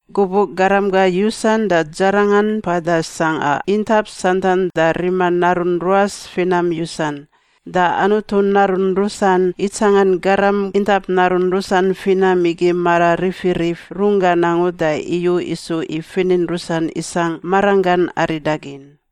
Gubuꞌ garam gar yusan da dzarangan mpada sangꞌa intap santan da rima narun ruas finam yusan, da Anutu narun rusan itsangan garam intap narun rusan finam igi mara rifirif runggan angu da iyu isu i finin rusan isangꞌ maranggan aridagin.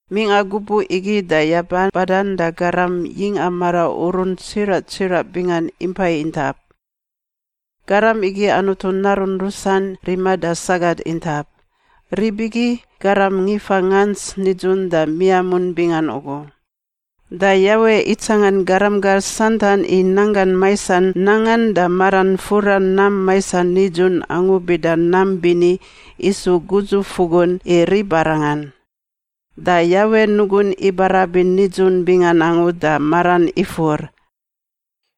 Mingꞌa gubuꞌ igi da yaba badan da garam yingꞌa maraurun tsiraꞌ tsiraꞌ bingan impai intap. Garam igi Anutu narun rusan rima da sagat intap. Rib igi garam ngifa ngants nidzun da miamun bingan ugu. Da Yawe itsangan garam gar santan i nanggan maisan nangan da maran fura nam maisan nidzun angu bida nam bini isu gudzufugun i ribarangan. Da Yawe nugun ibarabin nidzun bingan angu da maran ifur,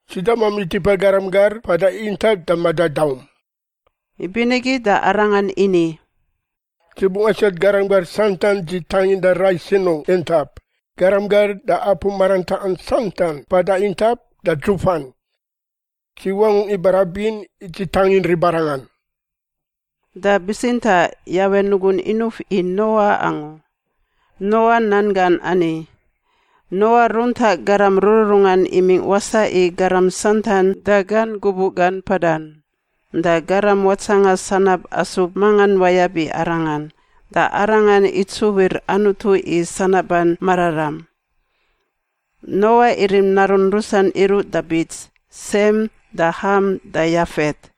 “Dzi damami tipa garam gar mpada intap da madadaum.” Ibinigi da Arangan ini, “Dzi bungꞌ asiat garam gar santan dzi tangindan rai sinungꞌ intap, garam gar da apu marantaꞌan santan mpada intap da dzufan. Dzi wangungꞌ ibarabin i dzi tangin ribarangan.” Da bitsintaꞌ Yawe nugun inuf i Noa angu. Noa nan gan ani. Noa runtaꞌ garam rururungan imingꞌ wasaꞌ i garam santan da gan gubuꞌ gan mpadan da garam watsanga sanab asub mangan wayab i arangan, da arangan itsuwir Anutu i sanaban mararam. Noa irim narun rusan iruꞌ da bits: Sem da Ham da Yafet.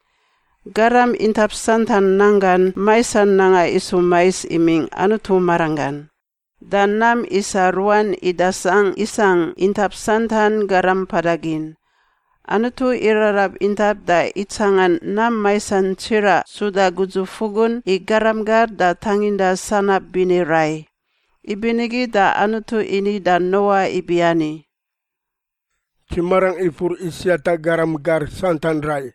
Garam intap santan nanggan maisan nangan isu mais imingꞌ Anutu maranggan. Da nam isa ruan idasangꞌ isangꞌ intap santan garam mpada gin. Anutu irarab intap da itsangan nam maisan tsiraꞌ suda gudzufugun i garam gar da tanginda sanab bini rai. Ibinigi da Anutu ini da Noa ibiani, “Dzi marangꞌ ifur i siata garam gar santan rai,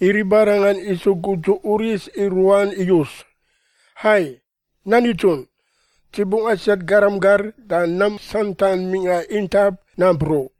i ribarangan isu gudzu uris i ruan iyus. Hai, nan nidzun! Dzi bungꞌ asiat garam gar da nam santan mingꞌa intap nampruꞌ.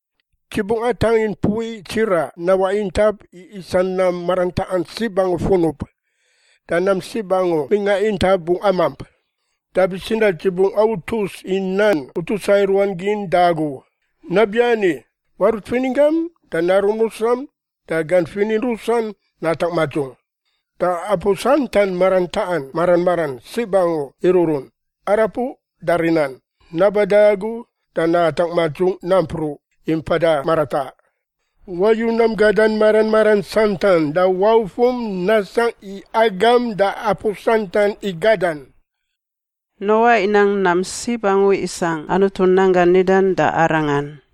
Dzi bungꞌ atangin mpui tsiraꞌ nawaꞌ intap i isa nam marantaꞌan sib angu funub. Da nam sib angu mingꞌa intap bungꞌ amamp. Da bitsintaꞌ dzi bungꞌ autus i nan utusa i ruan gin da agu. Nabiani, warut fininggam da narum rusam da gan finin rusan natangꞌ madzung. Da apu santan marantaꞌan mara maran sib angu iruꞌrun, arapuꞌ da rinan, naba da agu da natangꞌ madzung nampruꞌ i mpada marataꞌ. Wayu nam gadan mara maran santan da waufum nasangꞌ i agam da apu santan i gadan.” Noa inang nam sib angu isangꞌ Anutu nan gan nidan da arangan.